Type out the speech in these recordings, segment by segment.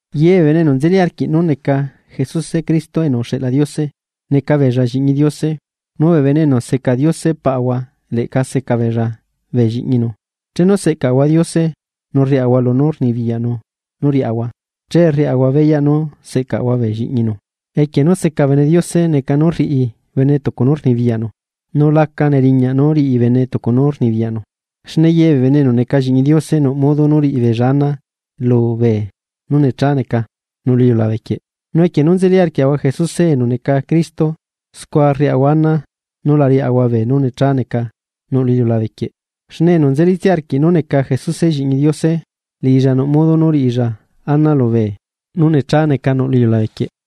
Ye bee bene enu nzeli arquiꞌ nú neca Jesuse Cristo enu uxeꞌla Diose, neca beella lliꞌñi Diose; nu bee bene enu seca Diose Paꞌahua leꞌca seca beella bee lliꞌñinu. Chenu seꞌcaꞌahua Diose nu rriaꞌahua lunú rnibiyaꞌnu nú riaꞌahua, che rriaꞌahua beyaꞌ nú seꞌcaꞌahua bee lliꞌñinu. Equie nú seca bene Diose neca nú rriꞌi bene tucu nú rnibiyaꞌnu; nu laca neriñaꞌ nu riꞌi bene tucu nú rnibiyaꞌnu. Xne ye bee bene enu neca Lliꞌñi Diose nuꞌ modo nú riꞌi beella ana lu beenú necha neca nuꞌ lu iliulabe quieꞌ. Nu equie nú nzeli arquiaꞌahua Jesuse enu neca Cristo scua rriaꞌahua ana nú la riaꞌahua beenú necha neca nuꞌ lu iliulabe quieꞌ. Xne enu nzelítsia arquiꞌ nú neca Jesuse Lliꞌñi Diose, liꞌilla nuꞌ modo nú rriꞌilla ana lubee nú necha neca nuꞌ lu iliulabe quieꞌ.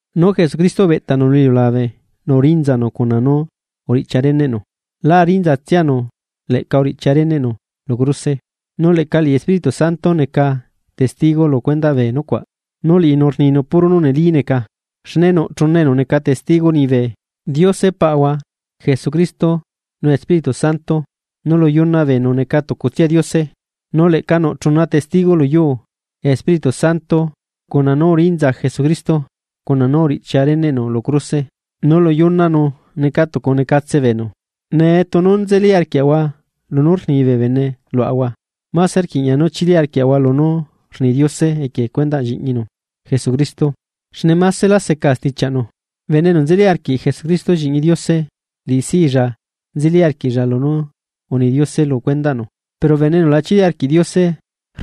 Nu Jesucristo ubeꞌtanu lu iliulabe nu urinzanu cuna nú uriꞌchia reneꞌnu; lá rinza tsianu leꞌca uriꞌchia reneꞌnu lu cruse. Nu leꞌca liꞌi Espíritu Santo neca testigo lu cuendaꞌ bee nucuaꞌ, nu liꞌinu rninu puro nú neli neca. Xne nuꞌ chuna enu neca testigo liñibe: Diose Paꞌahua, Jesucristo, nu Espíritu Santo; nu lu yuna beenu neca tucutsia Diose. Nu leꞌca nuꞌ chuna testigo lu yuu: Espíritu Santo, cuna nú urinza Jesucristo, cuna nú uriꞌchia reneꞌnu lu cruse; nu lu yunanu neca tucu necatse beenu. Nee tunu nzeli arquiaꞌahua lunú rni bee bene luaꞌahua; máse rquiꞌña nú chili arquiaꞌahua lunú rni Diose equie cuendaꞌ Lliꞌñinu Jesucristo, xne másela seca stichiaꞌnu. Bene enu nzeli arquiꞌ Jesucristo Lliꞌñi Diose, liꞌisilla nzeli arquiꞌlla lunú uni Diose lu cuendaꞌnu, pero bene enu la chili arquiꞌ Diose,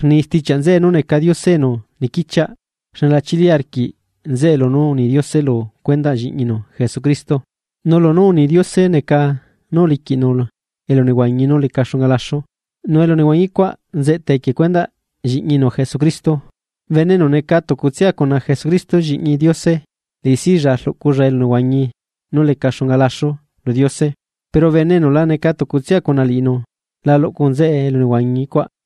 rni stichiaꞌ nzeꞌe nú neca Diose enu niquichiaꞌ xne la chili arquiꞌ nzeꞌe lunú uni Diose lu cuendaꞌ Lliꞌñinu Jesucristo. Nu lunú uni Diose neca nú uliquiꞌlanu elunehuañi nú leca xunga laxu, nu elunehuañi cuaꞌ nzeꞌta equie cuendaꞌ Lliꞌñinu Jesucristo. Bene enu neca tucutsia cuna Jesucristo Lliꞌñi Diose, liꞌisilla rluꞌculla elunehuañi nú leca xunga laxu lu Diose; pero bene enu la neca tucutsia cuna liꞌinu, la luꞌcu nzeꞌe elunehuañi cuaꞌ.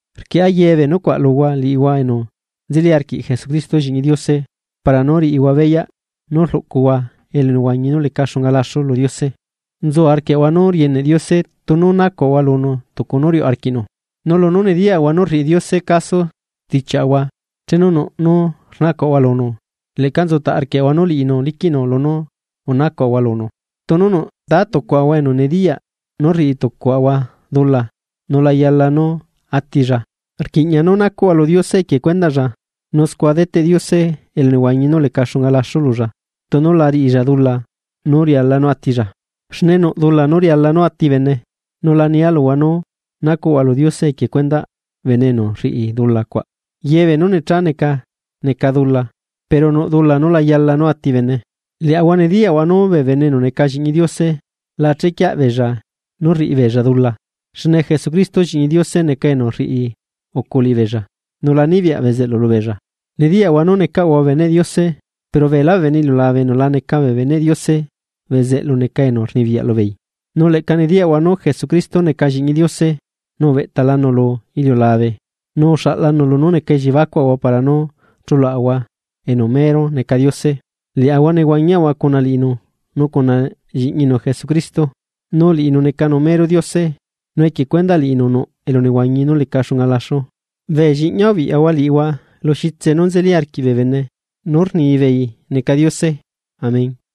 Rquieꞌa ye bee nucuaꞌ luhua liꞌihua enu nzeli arquiꞌ Jesucristo Lliꞌñi Diose, para nú riꞌihua beyaꞌ nú rluꞌcuhua elunehuañi nú leca xunga laxu lu Diose. Nzu arquiaꞌahua nú rieneꞌ Diose tunu nacuaꞌahua lunu tucu nú riuꞌ arquiꞌnu. Nu lunú nediyaꞌahua nu rriꞌi Diose caso stichiaꞌahua chenu nuꞌ nú rnacuaꞌahua lunu, leꞌca nzutaꞌ arquiaꞌahua nu liꞌinu liquiꞌnu lunú unacuaꞌahua lunu. Tunu nuꞌ tátucuaꞌahua enu nediyaꞌ nú rriꞌi tucuaꞌahua dula nu la yala nú atilla, rquiꞌña nú nacuꞌhua lu Diose equie cuendaꞌlla, nu scua deteꞌ Diose elunehuañi nú leca xunga laxu lulla tunu la riꞌilla dula nú riala nú atilla. Xne nuꞌ dula nú riala nú ati bene, nu la nia luhua nú nacuꞌhua lu Diose equie cundaꞌ bene enu rriꞌi dula cuaꞌ. Ye beenú necha neca, neca dula, pero nuꞌ dula nú la yala nú ati bene. Liaꞌahua nediyaꞌahua nu bee bene enu neca Lliꞌñi Diose, la chequiaꞌ beella nú rriꞌi beella dula; xne Jesucristo lliꞌñi Diose neca enu rriucu liꞌibeella, nu la nibiyaꞌ bezeꞌlu lubeella. Nediyaꞌahua nú necaꞌahua beneꞌ Diose, pero beelá bee bene iliulabe enu la neca bee beneꞌ Diose bezeꞌlu neca enu rnibiyaꞌ lubeei. Nu leꞌca nediyaꞌahua nú Jesucristo neca Lliꞌñi Diose, nu ubeꞌtalanu lu iliulabe nu uxaꞌlanu lunú neca elliebacuaꞌahua para nú chuluaꞌahua enu mero neca Diose. Liaꞌahua nehuañiaꞌahua cuna liꞌinu nu cuna Lliꞌñinu Jesucristo. Nu liꞌinu necanu mero Diose, nu equie cuendaꞌ liꞌinu nuꞌ elunehuañi nú leca xunga laxu. Bee lliꞌñia ubiꞌyahua liꞌihua lu xitse nú nzeli arquiꞌ bee bene nú rnibeei neca diose. Amén.